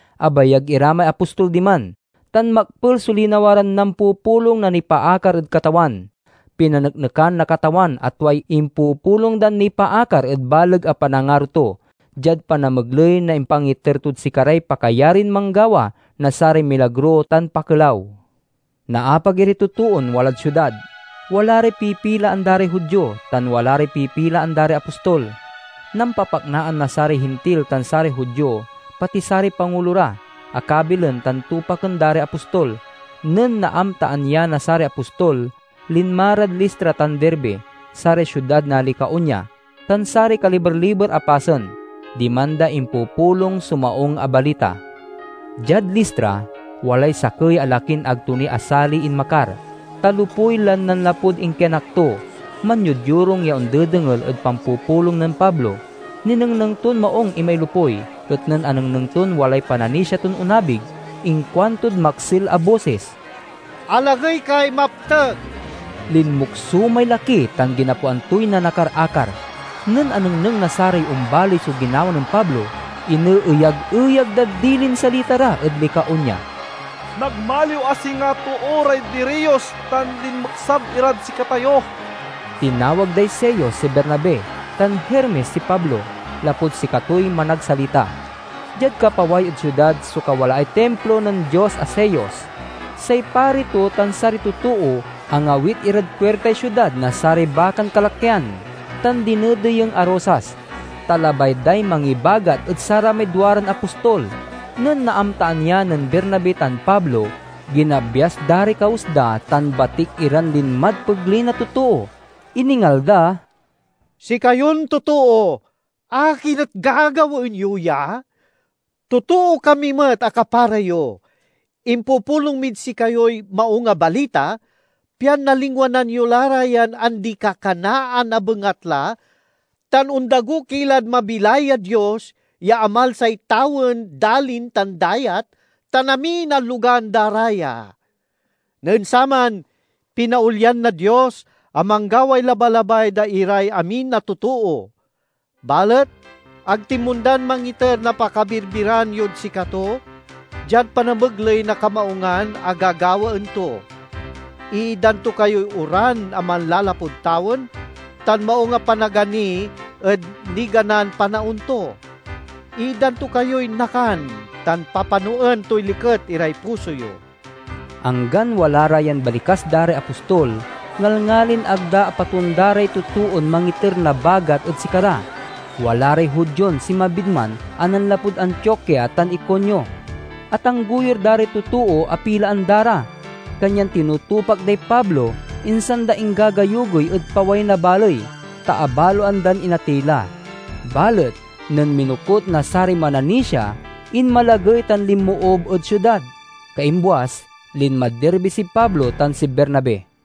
Abagay ira may apostol diman, tan makpel so linawa ran nampupulong na nipaakar ed Katawan. Pinaneknekan na Katawan a tuay impupulong dan nipaakar ed baleg a panangaro to, diad panamegley na impangiter tod sikaray pakayarin manggawa na saray milagro tan pakelaw. Naapag iray totoon walad siudad: wala ray pipilaan da ray Judio, tan wala ray pipilaan da ray apostol. Nampapaknaan na saray Hintil tan saray Judio, pati saray pangulo ra, a kabilen tan tupaken da ray apostol. Nen naamtaan ya na saray apostol, linma rad Listra tan Derbe, saray siudad na Licaonia, tan saray kaliber-liber a pasen. Diman da impupulong so Maung a Balita. Diad Listra, walay sakey a lakin ag to ni asaliy inmakar, ta lopuy lan nanlapud inkianak to. Manyodyorung ya ondedengel ed pampupulong nen Pablo. Ninengneng ton maung imay lopuy, et nen anengneng ton walay pananisia ton onabig, inkuantod maksil a bosis, "Alagey kay maptek!" Linmukso may laki tan ginapoan toy nanakar-akar. Nen anengneng na saray ombaley so ginawa nen Pablo, ineeyag-eyag dad dilin salita ra ed Licaonia, "Nagmaliw a singa too ray diriyos, tan linmeksab irad sikatayo!" Tinawag day Zeus si Bernabe, tan Hermes si Pablo, lapud sikatoy managsalita. Diad kapaway ed siudad so kawalaay timplo nen dios a Zeus. Say pari to tan saray totoo angawit irad puirtay siudad na saray bakan kalakyan tan dinedeyeng a rosas, ta labay day mangibagat ed saramay duaran apostol. Nen naamtaan ya nen Bernabe tan Pablo, ginabyas da ray kawes da tan batik iran linmad pegley na totoo. Iningal da, "Sikayon totoo, akin et gagawaen yo ya? Totoo kami met a kapara yo! Impupulong mid sikayoy Maung a Balita, pian nalingwanan yo la ra yan andi-kakanaan a bengatla tan ondago ki lad mabilay a Dios ya amalsay tawen, dalin, tan dayat, tan amin a logan da ra ya. Nen saman, pinaolyan na Dios a manggaway labalabay da iray amin a totoo. Balet ag tinmondan mangiter na pakabirbiran yod sikato, diad panamegley na kamaungan a gagawaen to. Iitdan to kayoy oran a manlalapud tawen tan maung a panagani ed niganan panaon to. Iitdan to kayoy nakan, tan papanoen toy likey iray puso yo." Anggan wala ra yan balikas da ray apostol ngalngalin ag da apatonda ray totoon mangiter na bagat ed sikara. Wala ray Judion sinmabid man a nanlapud Antiokia tan Iconio. Atanggoyur da ray totoo a pilaan da ra, kanyan tinutupak day Pablo, insan da inggagayugoy ed paway na baley, ta abaloan dan inatey la. Balet nen minokut na saray mananisia, inmalagey tan linmoob ed siudad. Kaimbuas, linmad Derbe si Pablo tan si Bernabe.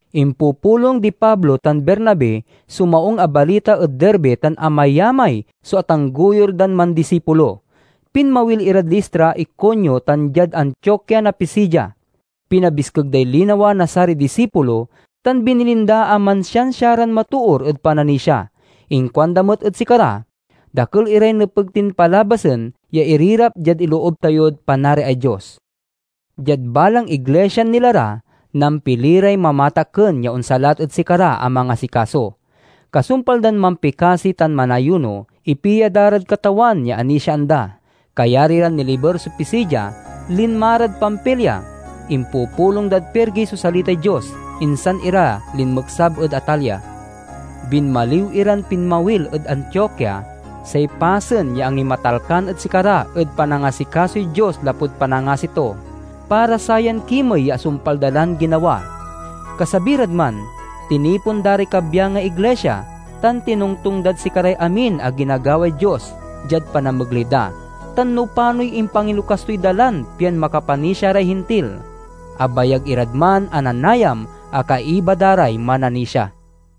Impupulong di Pablo tan Bernabe so Maung a Balita ed Derbe tan amayamay so atanggoyur dan mandisipulo. Pinmawil irad Listra, Iconio, tan diad Antiokia na Pisidia. Pinabiskeg day linawa na saray disipulo, tan binilin da a mansiansia ran matoor ed pananisia. Inkuanda met ed sikara, "Dakel iray nepeg tin palabasen ya irirap diad iloob tayod Panariay Dios." Diad balang iglisian nila ra, nampili ray mamatakken ya onsalat ed sikara a mangasikaso. Kasumpal dan mampikasi tan manayuno, ipia da rad Katawan ya anisiaan da. Kayari ran niliber so Pisidia, linma rad Pamfilia. Impupulong dad Perge so salitay Dios, insan ira linmeksab ed Atalia. Binmaliw iran pinmawil ed Antiokia, say pasen ya angimatalkan ed sikara ed panangasikasoy Dios lapud panangasi to, para sayan kimey ya asumpal da lan ginawa. Kasabi rad man, tinipon da ray kabyangay iglisia, tan tinongtong dad sikaray amin a ginagaway Dios diad panamegley da, tan no panoy impangilokas toy dalan pian makapanisia ray Hintil. Abayag irad man a nanayam a kaiba da ray mananisia.